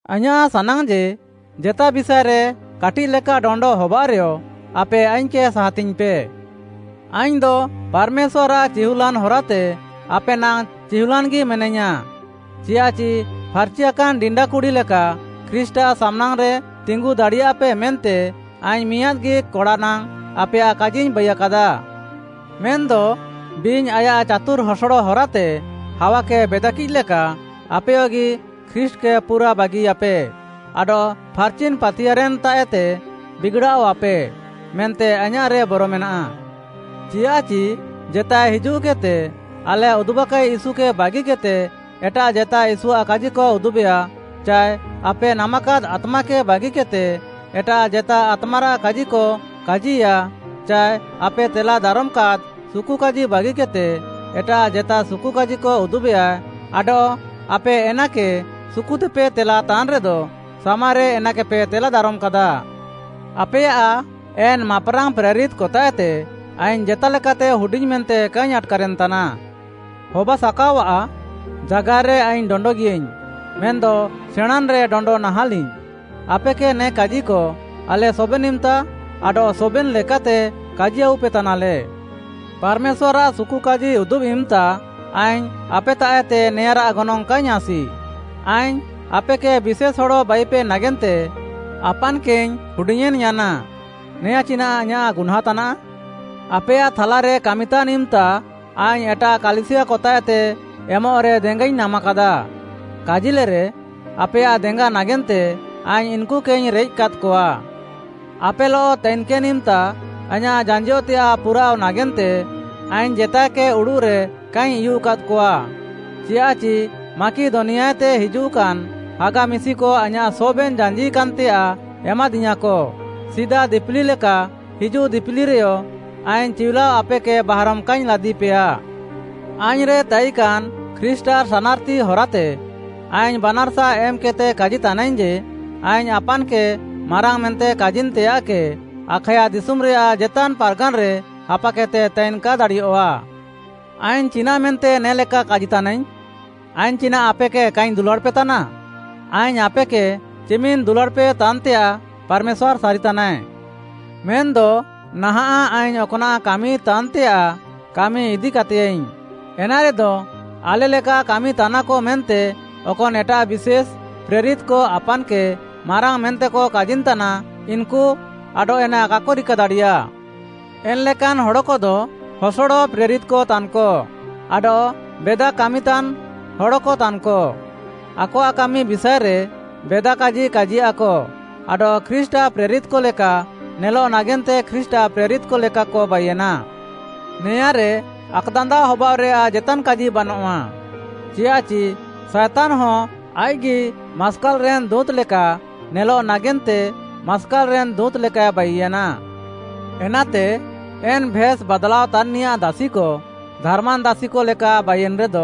ଆଇଁୟାଃ ସାନାଙ୍ଗ୍‌ ଯେ, ଜେତା ବିଷାଏରେ କାଟିଃଲେକା ଡଣ୍ଡ ହବାଅଃରେୟ ଆପେ ଆଇଙ୍ଗ୍‌କେ ସାହାତିଙ୍ଗ୍‌ପେ। ଆଇଙ୍ଗ୍‌ଦ ପାର୍‌ମେଶ୍ୱାର୍‌ଆଃ ଚିହୁଲ୍‌ଲାନ୍‌ ହରାତେ ଆପେ ନାଙ୍ଗ୍‌ ଚିହୁଲାନ୍‌ଗି ମେନାଇୟାଁ, ଚିୟାଃଚି ଫାର୍‌ଚିୟାକାନ୍‌ ଡିଣ୍ଡା କୁଡ଼ି ଲେକା ଖ୍ରୀଷ୍ଟ୍‌ଆଃ ସାମ୍‌ନାଙ୍ଗ୍‌ରେ ତିଙ୍ଗୁଦାଡ଼ିପେ ମେନ୍ତେ ଆଇଙ୍ଗ୍‌ ମିଆଁଦ୍‌ଗି କଡ଼ାନାଙ୍ଗ୍‌ ଆପେୟାଃ କାଜିଇଙ୍ଗ୍‌ ବାଇୟାକାଦା। ମେନ୍‌ଦ ବିଙ୍ଗ୍‌ ଆୟାଃ ଚାତୁର୍‌ ହସଡ଼ ହରାତେ ହାୱାକେ ବେଦାକିଃ ଲେକା, ଆପେୟଗି ଖ୍ରୀଷ୍ଟ୍‌କେ ପୁରା ବାଗିୟାପେ ଆଡଃ ଫାର୍‌ଚିନ୍‌ ପାତିୟାର୍‌ରେନ୍‌ତାଃଏତେ ବିଗ୍‌ଡ଼ାଅଃଆପେ, ମେନ୍ତେ ଆଇଁୟାଃ ବର ମେନାଃ। ଚିୟାଃଚି ଜେତାଏ ହିଜୁଃକେଦ୍‌ତେ ଆଲେ ଉଦୁବାକାଇ ୟୀଶୁକେ ବାଗିକେଦ୍‌ତେ ଏଟାଃ ଜେତା ୟୀଶୁଆଃ କାଜିକ ଉଦୁବେୟା ଚାଏ ଆପେ ନାମାକାଦ୍‌ ଆତ୍ମାକେ ବାଗିକେଦ୍‌ତେ ଏଟାଃ ଜେତା ଆତ୍ମାରାଃ କାଜିକ କାଜିୟା ଚାଏ ଆପେ ତେଲା ଦାରମ୍‌କାଦ୍‌ ସୁକୁକାଜି ବାଗିକେଦ୍‌ତେ ଏଟାଃ ଜେତା ସୁକୁକାଜିକ ଉଦୁବେୟା ଆଡଃ ଆପେ ଏନାକେ ସୁକୁତେପେ ତେଲା ତାନ୍‌ରେଦ, ସାମାରେ ଏନାକେପେ ତେଲା ଦାରମ୍‌କାଦା। ଆପେୟାଃ ଏନ୍‌ ମାପ୍‌ରାଙ୍ଗ୍‌ ପ୍ରେରିତ୍‌କତାଃଏତେ ଆଇଙ୍ଗ୍‌ ଜେତାଲେକାତେ ହୁଡିଙ୍ଗ୍‌ ମେନ୍ତେ କାଇଙ୍ଗ୍‌ ଆଟ୍‌କାରେନ୍‌ତାନା। ହବାସାକାଅଆଃ, ଜାଗାର୍‍ରେ ଆଇଙ୍ଗ୍‌ ଡଣ୍ଡଗିୟାଇଙ୍ଗ୍‌, ମେନ୍‌ଦ ସେଣାଁଁନ୍‌ରେ ଡଣ୍ଡ ନାହାଁଲିଙ୍ଗ୍‌। ଆପେକେ ନେ କାଜିକ ଆଲେ ସବେନ୍‌ ଇମ୍‌ତା ଆଡଃ ସବେନ୍‌ ଲେକାତେ କାଜି ଆଉପେତାନାଲେ। ପାର୍‌ମେଶ୍ୱାର୍‌ଆଃ ସୁକୁକାଜି ଉଦୁବ୍‌ ଇମ୍‌ତା ଆଇଙ୍ଗ୍‌ ଆପେତାଃଏତେ ନେଆଁଁରାଃ ଗନଙ୍ଗ୍‌ କାଇଙ୍ଗ୍‌ ଆସି। ଆଇଙ୍ଗ୍‌ ଆପେକେ ବିଶେଷ୍‌ ହଡ଼ ବାଇପେ ନାଗେନ୍ତେ ଆପାନ୍‌କେଇଙ୍ଗ୍‌ ହୁଡିଙ୍ଗ୍‌ୟେଁନ୍‌ୟାନା। ନେଆଁଁ ଚିନାଃ ଆଇଁୟାଃ ଗୁହ୍ନାଁଁ ତାନାଃ? ଆପେୟାଃ ଥାଲାରେ କାମିତାନ୍‌ ଇମ୍‌ତା ଆଇଙ୍ଗ୍‌ ଏଟାଃ କାଲିସିୟାକତାଃଏତେ ଏମଃରେ ଦେଙ୍ଗାଇଙ୍ଗ୍‌ ନାମାକାଦା। କାଜିଲେରେ, ଆପେୟାଃ ଦେଙ୍ଗା ନାଗେନ୍ତେ ଆଇଙ୍ଗ୍‌ ଇନ୍‌କୁକେଇଙ୍ଗ୍‌ ରେଏଃକାଦ୍‌କଆ। ଆପେଲଃ ତାଇକେନ୍‌ ଇମ୍‌ତା ଆଇଁୟାଃ ଜାଞ୍ଜିଅଃତେୟାଃ ପୁରାଅଃ ନାଗେନ୍ତେ ଆଇଙ୍ଗ୍‌ ଜେତାଏକେ ଉଡ଼ୁଃରେ କାଇଙ୍ଗ୍‌ ଉୟୁଃକାଦ୍‌କଆ। ଚିୟାଃଚି ମାକିଦନିଆଏତେ ହିଜୁଃକାନ୍‌ ହାଗା ମିଶିକ ଆଇଁୟାଃ ସବେନ୍‌ ଜାଞ୍ଜିକାନ୍‌ତେୟାଃ ଏମାଦିୟାଁକ। ସିଦା ଦିପିଲି ଲେକା ହିଜୁଃ ଦିପିଲିରେୟ ଆଇଙ୍ଗ୍‌ ଚିଉଲାଅ ଆପେକେ ବାହାରମ୍‌ କାଇଙ୍ଗ୍‌ ଲାଦିପେୟା। ଆଇଙ୍ଗ୍‌ରେ ତାଇକାନ୍‌ ଖ୍ରୀଷ୍ଟ୍‌ଆଃ ସାନାର୍‌ତି ହରାତେ, ଆଇଙ୍ଗ୍‌ ବାନାର୍‌ସା ଏମ୍‌କେଦ୍‌ତେ କାଜିତାନାଇଙ୍ଗ୍‌ ଯେ, ଆଇଙ୍ଗ୍‌ ଆପାନ୍‌କେ ମାରାଙ୍ଗ୍‌ ମେନ୍ତେ କାଜିନ୍‌ତେୟାଃକେ, ଆଖାୟା ଦିଶୁମ୍‌ରେୟାଃ ଜେତାନ୍‌ ପାର୍‌ଗାନ୍‌ରେ ହାପାକେଦ୍‌ତେ ତାଇନ୍‌ କା ଦାଡ଼ିୟଃଆ। ଆଇଙ୍ଗ୍‌ ଚିନାଃ ମେନ୍ତେ ନେ'ଲେକା କାଜିତାନାଇଙ୍ଗ୍‌? ଆଇଙ୍ଗ୍‌ ଚିନାଃ ଆପେକେ କାଇଙ୍ଗ୍‌ ଦୁଲାଡ଼୍‌ପେ ତାନା? ଆଇଙ୍ଗ୍‌ ଆପେକେ ଚିମିନ୍‌ ଦୁଲାଡ଼୍‌ପେ ତାନ୍‌ତେୟାଃ, ପାର୍‌ମେଶ୍ୱାର୍‌ ସାରିତାନାଏ। ମେନ୍‌ଦ ନାହାଁଃ ଆଇଙ୍ଗ୍‌ ଅକ୍‌ନାଃ କାମିତାନ୍‌ତେୟାଃ, କାମି ଇଦିକାତେୟାଃଇ। ଏନାରେଦ, ଆଲେ ଲେକା କାମିତାନାକ ମେନ୍ତେ ଅକନ୍‌ ଏଟାଃ ବିଷେଶ୍‌ “ପ୍ରେରିତ୍‌କ” ଆପାନ୍‌କେ ମାରାଙ୍ଗ୍‌ ମେନ୍ତେକ କାଜିନ୍‌ତାନା, ଇନ୍‌କୁ ଆଡଃ ଏନା କାକ ରିକାଦାଡ଼ିୟା। ଏନ୍‌ଲେକାନ୍ ହଡ଼କଦ ହସଡ଼ ପ୍ରେରିତ୍‌କ ତାନ୍‌କ ଆଡଃ ବେଦା କାମିତାନ୍‍ ହଡ଼କତାନ୍‌କ, ଆକଆଃ କାମି ବିଷାଏରେ ବେଦା କାଜି କାଜିୟାଃକ ଆଡଃ ଖ୍ରୀଷ୍ଟ୍‌ଆଃ ପ୍ରେରିତ୍‌କ ଲେକା ନେଲଃ ନାଗେନ୍ତେ ଖ୍ରୀଷ୍ଟ୍‌ଆଃ ପ୍ରେରିତ୍‌କ ଲେକାକ ବାଇୟେନା। ନେଆଁଁରେ ଆକ୍‌ଦାନ୍ଦାଅ ହବାଅଃରେୟାଃ ଜେତାନ୍‌ କାଜି ବାନଃଆ, ଚିୟାଃଚି ସାଏତାନ୍‌ହଁ ଆଇଃକ୍‌ଗି ମାସ୍କାଲ୍‌ରେନ୍‌ ଦୁଁତ୍‌ ଲେକା ନେଲଃ ନାଗେନ୍ତେ ମାସ୍କାଲ୍‌ରେନ୍‌ ଦୁଁତ୍‌ ଲେକାଏ ବାଇୟେନା। ଏନାତେ ଏନ୍‌ ଭେସ୍‌ ବାଦ୍‌ଲାଅ ତାନ୍‌ନିୟାଃ ଦାସିକ, ଧାର୍‌ମାନ୍‌ ଦାସିକ ଲେକା ବାଇୟେନ୍‌ରେଦ,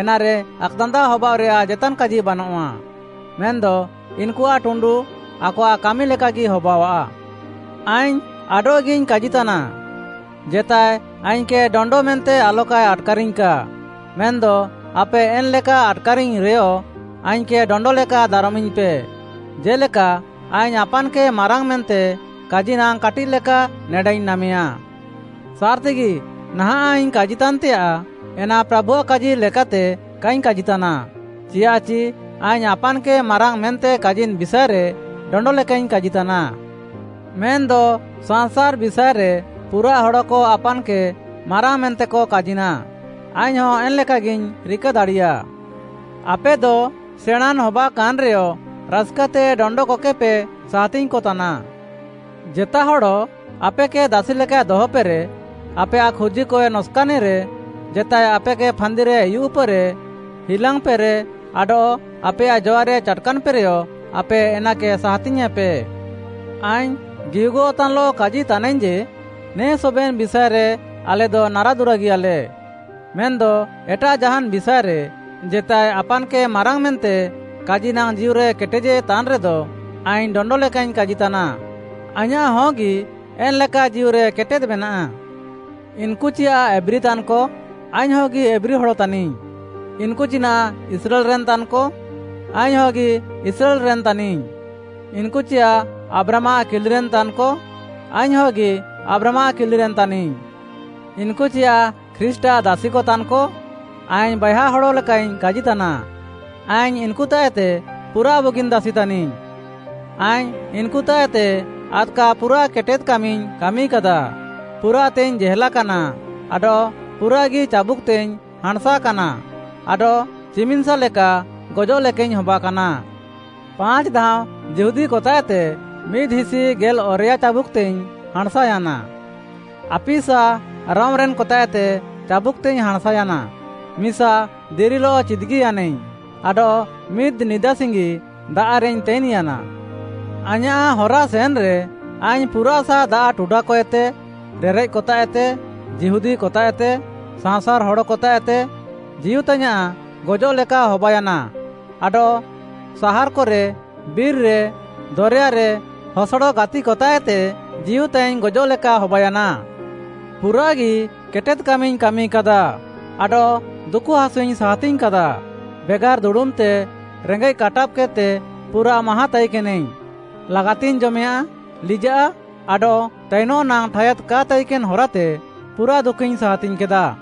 ଏନାରେ ଆକ୍‌ଦାନ୍ଦାଅ ହବାଅଃରେୟାଃ ଜେତାନ୍‌ କାଜି ବାନଃଆ, ମେନ୍‌ଦ ଇନ୍‌କୁଆଃ ଟୁଣ୍ଡୁ ଆକଆଃ କାମି ଲେକାଗି ହବାଅଃଆ। ଆଇଙ୍ଗ୍‌ ଆଡଃଗିଇଙ୍ଗ୍‌ କାଜିତାନା, ଜେତାଏ ଆଇଙ୍ଗ୍‌କେ ଡଣ୍ଡ ମେନ୍ତେ ଆଲକାଏ ଆଟ୍‌କାରିଙ୍ଗ୍‌କା, ମେନ୍‌ଦ ଆପେ ଏନ୍‌ଲେକା ଆଟ୍‌କାରିଙ୍ଗ୍‌ ରେୟ, ଆଇଙ୍ଗ୍‌କେ ଡଣ୍ଡ ଲେକା ଦାରମିଙ୍ଗ୍‌ପେ, ଜେ'ଲେକା ଆଇଙ୍ଗ୍‌ ଆପାନ୍‌କେ ମାରାଙ୍ଗ୍‌ ମେନ୍ତେ କାଜି ନାଙ୍ଗ୍‌ କାଟିଃଲେକା ନେଡାଇଙ୍ଗ୍‌ ନାମେୟା। ସାର୍‌ତିଗି, ନାହାଁଃ ଆଇଙ୍ଗ୍‌ କାଜିତାନ୍‌ତେୟାଃ, ଏନା ପ୍ରାଭୁଆଃ କାଜି ଲେକାତେ କାଇଙ୍ଗ୍‌ କାଜିତାନା। ଚିୟାଃଚି ଆଇଙ୍ଗ୍‌ ଆପାନ୍‌କେ ମାରାଙ୍ଗ୍‌ ମେନ୍ତେ କାଜିନ୍‌ ବିଷାଏରେ ଡଣ୍ଡ ଲେକାଇଙ୍ଗ୍‌ କାଜିତାନା। ମେନ୍‌ଦ ସାଂସାର୍‌ ବିଷାଏରେ ପୁରାଃ ହଡ଼କ ଆପାନ୍‌କେ ମାରାଙ୍ଗ୍‌ ମେନ୍ତେକ କାଜିନା, ଆଇଙ୍ଗ୍‌ହଁ ଏନ୍‌ ଲେକାଗିଇଙ୍ଗ୍‌ ରିକା ଦାଡ଼ିୟା। ଆପେଦ ସେଣାଁଁନ୍‌ ହବାକାନ୍‌ରେୟ ରାସ୍‌କାତେ ଡଣ୍ଡକକେପେ ସାହାତିଙ୍ଗ୍‌କ ତାନା। ଜେତା ହଡ଼ ଆପେକେ ଦାସିଲେକାଏ ଦହପେରେ, ଆପେୟାଃ ଖୁର୍ଜିକଏ ନକ୍‌ସାନେରେ, ଜେତାଏ ଆପେକେ ଫାନ୍ଦିରେ ଉୟୁଃପେରେ, ହିଲାଙ୍ଗ୍‌ପେରେ, ଆଡଃ ଆପେୟାଃ ଜଆରେ ଚାଟ୍‌କାନ୍‌ପେରେୟ ଆପେ ଏନାକେ ସାହାତିଙ୍ଗ୍‌ୟେଁପେ। ଆଇଙ୍ଗ୍‌ ଗିହୁଗଃତାନ୍‌ଲଃ କାଜିତାନାଇଙ୍ଗ୍‌ ଯେ, ନେ ସବେନ୍‌ ବିଷାଏରେ ଆଲେଦ ନାରାଦୁରାଗିୟାଲେ। ମେନ୍‌ଦ ଏଟାଃ ଜାହାନ୍‌ ବିଷାଏରେ ଜେତାଏ ଆପାନ୍‌କେ ମାରାଙ୍ଗ୍‌ ମେନ୍ତେ କାଜି ନାଙ୍ଗ୍‌ ଜୀଉରେ କେଟେଦ୍‌ଜେ ତାନ୍‌ରେଦ, ଆଇଙ୍ଗ୍‌ ଡଣ୍ଡ ଲେକାଇଙ୍ଗ୍‌ କାଜିତାନା, ଆଇଁୟାଃ ହଗି ଏନ୍‌ ଲେକା ଜୀଉରେ କେଟେଦ୍‌ ମେନାଃ। ଇନ୍‌କୁ ଚିୟାଃ ଏବ୍ରୀ ତାନ୍‌କ? ଆଇଙ୍ଗ୍‌ହଗି ଏବ୍ରୀ ହଡ଼ ତାନିଙ୍ଗ୍‌। ଇନ୍‌କୁ ଚିନାଃ ଇସ୍ରାଏଲ୍‌ରେନ୍‌ ତାନ୍‌କ? ଆଇଙ୍ଗ୍‌ହଗି ଇସ୍ରାଏଲ୍‌ରେନ୍‌ ତାନିଙ୍ଗ୍‌। ଇନ୍‌କୁ ଚିୟାଃ ଆବ୍ରାହାମ୍‌ଆଃ କିଲିରେନ୍‌କ ତାନ୍‌କ? ଆଇଙ୍ଗ୍‌ହଗି ଆବ୍ରାହାମ୍‌ଆଃ କିଲିରେନ୍‌ ତାନିଙ୍ଗ୍‌। ଇନ୍‌କୁ ଚିୟାଃ ଖ୍ରୀଷ୍ଟ୍‌ଆଃ ଦାସିକ ତାନ୍‌କ? ଆଇଙ୍ଗ୍‌ ବାଏହା ହଡ଼ ଲେକାଇଙ୍ଗ୍‌ କାଜି ତାନା, ଆଇଙ୍ଗ୍‌ ଇନ୍‌କୁତାଃଏତେ ପୁରାଃ ବୁଗିନ୍‌ ଦାସି ତାନିଙ୍ଗ୍‌। ଆଇଙ୍ଗ୍‌ ଇନ୍‌କୁତାଃଏତେ ଆଦ୍‌କା ପୁରାଃ କେଟେଦ୍‌କାମିଇଙ୍ଗ୍‌ କାମିକାଦା, ପୁରାଃତେଇଙ୍ଗ୍‌ ଜେହେଲାକାନା, ଆଡଃ ପୁରାଃଗି ଚାବୁକ୍‌ତେଇଙ୍ଗ୍‌ ହାଁଣ୍‌ସାକାନା ଆଡଃ ଚିମିନ୍‌ସା ଲେକା ଗଜଃ ଲେକାଇଙ୍ଗ୍‌ ହବାକାନା। ପାଞ୍ଚ୍‌ ଧାଅଁ ଯିହୁଦୀକତାଃଏତେ ମିଦ୍‌ହିସି ଗେଲ୍‌ଅରେୟା ଚାବୁକ୍‌ତେଇଙ୍ଗ୍‌ ହାଁଣ୍‌ସାୟାନା। ଆପିସା ରୋମ୍‌ରେନ୍‌କତାଃଏତେ ଚାବୁକ୍‌ତେଇଙ୍ଗ୍‌ ହାଁଣ୍‌ସାୟାନା। ମିସା ଦିରିଲଃ ଚିଦ୍‌ଗିୟାନାଇଙ୍ଗ୍‌ ଆଡଃ ମିଦ୍‌ ନିଦାସିଙ୍ଗି ଦାଆଃରେଇଙ୍ଗ୍‌ ତାଇନ୍‌ୟାନା। ଆଇଁୟାଃ ହରାସେନ୍‌ରେ ଆଇଙ୍ଗ୍‌ ପୁରାଃସା ଦାଆଃ ଟୁଡାକଏତେ, ରେରେଃକ୍‌କତାଃଏତେ, ଯିହୁଦୀକତାଃଏତେ, ସାଅଁସାର୍‌ ହଡ଼କତାଃଏତେ, ଜୀଉତାଇଙ୍ଗ୍‌ ଗଜଃ ଲେକା ହବାୟାନା ଆଡଃ ସାହାର୍‌କରେ, ବିର୍‌ରେ, ଦରେୟାରେ, ହସଡ଼ ଗାତିକତାଃଏତେ ଜୀଉତାଇଙ୍ଗ୍‌ ଗଜଃ ଲେକା ହବାୟାନା। ପୁରାଃଗି କେଟେଦ୍‌କାମିଙ୍ଗ୍‌ କାମିକାଦା ଆଡଃ ଦୁକୁହାସୁଇଙ୍ଗ୍‌ ସାହାତିଙ୍ଗ୍‌କାଦା, ବେଗାର୍‌ ଦୁଡ଼ୁମ୍‌ତେ, ରେଙ୍ଗେଃ କାଟାବ୍‌କେଦ୍‌ତେ ପୁରାଃ ମାହାଁ ତାଇକେନାଇଙ୍ଗ୍‌, ଲାଗାତିଙ୍ଗ୍‌ ଜମେୟାଁଃ, ଲିଜାଃ ଆଡଃ ତାଇନଃ ନାଙ୍ଗ୍‌ ଠାୟାଦ୍‌ କା ତାଇକେନ୍‌ ହାରାତେ ପୁରାଃ ଦୁକୁଇଙ୍ଗ୍‌ ସାହାତିଙ୍ଗ୍‌କାଦା।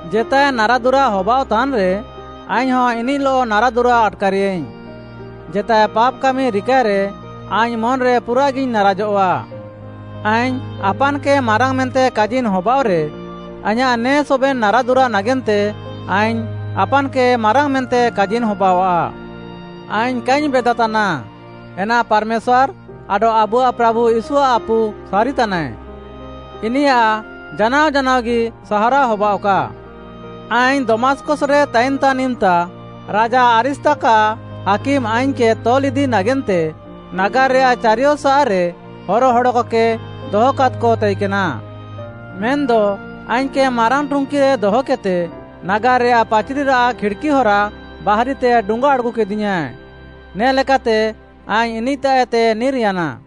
ଜେତାଏ ନାରାଦୁରା ହବାଅଃତାନ୍‌ରେ, ଆଇଙ୍ଗ୍‌ହଁ ଇନିଃଲଃ ନାରାଦୁରା ଆଟ୍‌କାରେୟାଇଙ୍ଗ୍‌। ଜେତାଏ ପାପ୍‌କାମି ରିକାଏରେ, ଆଇଙ୍ଗ୍‌ ମନ୍‌ରେ ପୁରାଃଗିଇଙ୍ଗ୍‌ ନାରାଜଃଆ। ଆଇଙ୍ଗ୍‌ ଆପାନ୍‌କେ ମାରାଙ୍ଗ୍‌ ମେନ୍ତେ କାଜିନ୍‌ ହବାଅଃରେ, ଆଇଁୟାଃ ନେ ସବେନ୍‌ ନାରାଦୁରା ନାଗେନ୍ତେ ଆଇଙ୍ଗ୍‌ ଆପାନ୍‌କେ ମାରାଙ୍ଗ୍‌ ମେନ୍ତେ କାଜିନ୍‌ ହବାଅଃଆ। ଆଇଙ୍ଗ୍‌ କାଇଙ୍ଗ୍‌ ବେଦାତାନା, ଏନା ପାର୍‌ମେଶ୍ୱାର୍‌ ଆଡଃ ଆବୁଆଃ ପ୍ରାଭୁ ୟୀଶୁଆଃ ଆପୁ ସାରିତାନାଏ। ଇନିୟାଃ ଜାନାଅ ଜାନାଅଗି ସାହାରାଅ ହବାଅଃକା। ଆଇଙ୍ଗ୍‌ ଦମାସ୍‌କସ୍‌ରେ ତାଇନ୍‌ତାନ୍‌ ଇମ୍‌ତା ରାଜା ଆରିସ୍ତାକ୍‌ଆଃ ହାକିମ୍‌ ଆଇଙ୍ଗ୍‌କେ ତଲ୍‌ଇଦି ନାଗେନ୍ତେ ନାଗାର୍‌ରେୟାଃ ଚାରିୟସାଃରେ ହର ହଡ଼କକେ ଦହକାଦ୍‌କ ତାଇକେନା। ମେନ୍‌ଦ ଆଇଙ୍ଗ୍‌କେ ମାରାଙ୍ଗ୍‌ ଟୁଙ୍କିରେ ଦହକେଦ୍‌ତେ ନାଗାର୍‌ରେୟାଃ ପାଚ୍‌ରିରାଃ ଖିଡ଼୍‌କି ହରା ବାହାରିତେ ଡୁଙ୍ଗା ଆଡ଼୍‌ଗୁକେଦିୟାଁ, ନେ ଲେକାତେ ଆଇଙ୍ଗ୍‌ ଇନିଃତାଃଏତେଇଙ୍ଗ୍‌ ନିର୍‌ୟାନା।